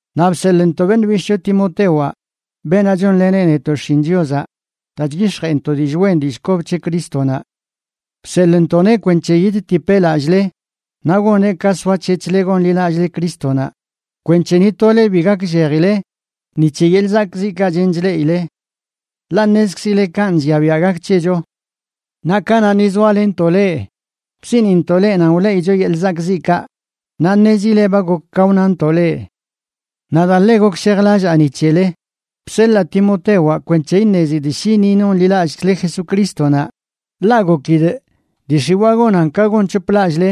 naꞌ bseḻꞌntoꞌ beṉꞌ bishꞌcho Timotewaꞌ, beenaꞌ chonleneꞌ netoꞌ xshin Chiozaꞌ daa chyix̱jeꞌnto dillꞌ wen dillꞌ kob c̱he Crístonaꞌ. Bseḻꞌntoꞌneꞌ kwenc̱he yidtipeꞌ lallꞌle naꞌ goneꞌ ka soac̱hec̱hle gonḻilallꞌle Crístonaꞌ, kwenc̱he ni tole bi gakllejile ni c̱he yeḻꞌ zakꞌziꞌkaꞌ chen chleꞌile. Ḻaꞌ ṉezkzile kanꞌ llia biaꞌ gak c̱hecho. Naꞌ kanaꞌ ni zoalenntoꞌ leꞌ, bsiꞌnintoꞌ leꞌ nan wleꞌicho yeḻꞌ zakꞌziꞌkaꞌ, naꞌ ṉezile ba gok ka wnantoꞌ leꞌ. Naꞌ daa ḻe gokshejlallaa ni c̱hele, bseḻaa Timotewaꞌ kwenc̱he iṉezidꞌ shi ni nonḻilallꞌkzle Jesucrístonaꞌ, ḻaꞌ gokidꞌ dii x̱iwaa gonan ka gonc̱hoplallꞌle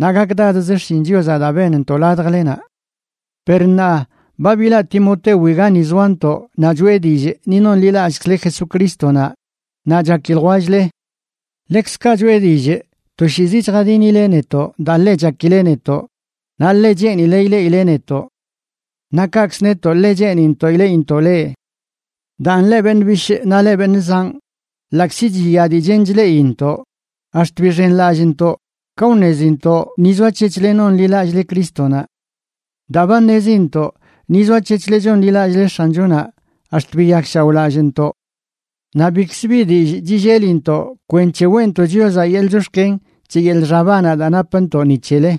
naꞌ gakdadz xshin Chiozaꞌ daa benntoꞌ ladjlenaꞌ. Per ṉaa ba bilaꞌ Timotewi gani zoantoꞌ naꞌ choꞌe dillꞌ ni nonḻilallꞌkzle Jesucrístonaꞌ naꞌ chaki ljwell-le. Ḻekzkaꞌ choꞌe dillꞌ toshiizi chjadinile netoꞌ daa ḻe chakile netoꞌ, naꞌ ḻe cheenile ileꞌile netoꞌ. Naꞌ kaꞌkz netoꞌ, ḻe cheenintoꞌ ileꞌintoꞌ leꞌ. Daan, leꞌ beṉꞌ bishꞌ naꞌ leꞌ beṉꞌ zanꞌ, ḻaꞌkzi chiya dii chen chleꞌintoꞌ, ax̱t bixenlallꞌntoꞌ ka wṉezintoꞌ ni zoac̱hec̱hle nonḻilallꞌle Crístonaꞌ. Daa ba ṉezintoꞌ ni zoac̱hec̱hle chonḻilallꞌle X̱anchonaꞌ, ax̱t biyakshaoꞌlallꞌntoꞌ. Naꞌ bichkz bi dillꞌ chillelintoꞌ kwenc̱he weꞌntoꞌ Chiozaꞌ yeḻꞌ chox̱ken c̱he yeḻꞌ xabanaꞌ daa napntoꞌ ni c̱hele.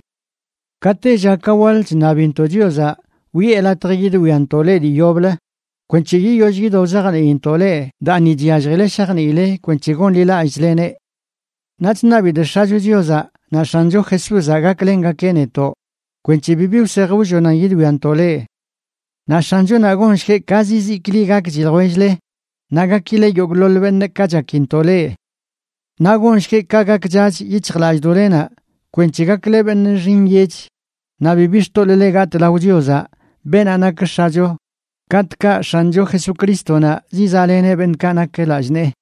Ka tella ka waḻ chṉabintoꞌ Chiozaꞌ wiꞌe latj yidwiantoꞌ leꞌ dii yoblə kwenc̱he yiyoll yido wzajniintoꞌ leꞌ daa ni chyalljile shajniile kwenc̱he gonḻilallꞌchleneꞌ. Naꞌ chṉabidꞌ X̱acho Chiozaꞌ naꞌ X̱ancho Jesúzaꞌ gaklengakeꞌ netoꞌ kwenc̱he bibi wsej wllonan yidwiantoꞌ leꞌ. Naꞌ X̱anchonaꞌ gonshgueꞌ ka zizikli gakchi ljwell-le naꞌ gakile yogꞌḻoḻ beṉꞌ, ka chakintoꞌ leꞌ. Naꞌ gonshgueꞌ ka gakchach yic̱hjlallꞌdoꞌlenaꞌ kwenc̱he gakle beṉꞌ nxi nyech naꞌ bibi xtoḻꞌle gatꞌ lao Chiozaꞌ, beenaꞌ nak X̱acho, katꞌkaꞌ X̱ancho Jesucrístonaꞌ zizaꞌleneꞌ beṉꞌkaꞌ nak lallꞌ nee.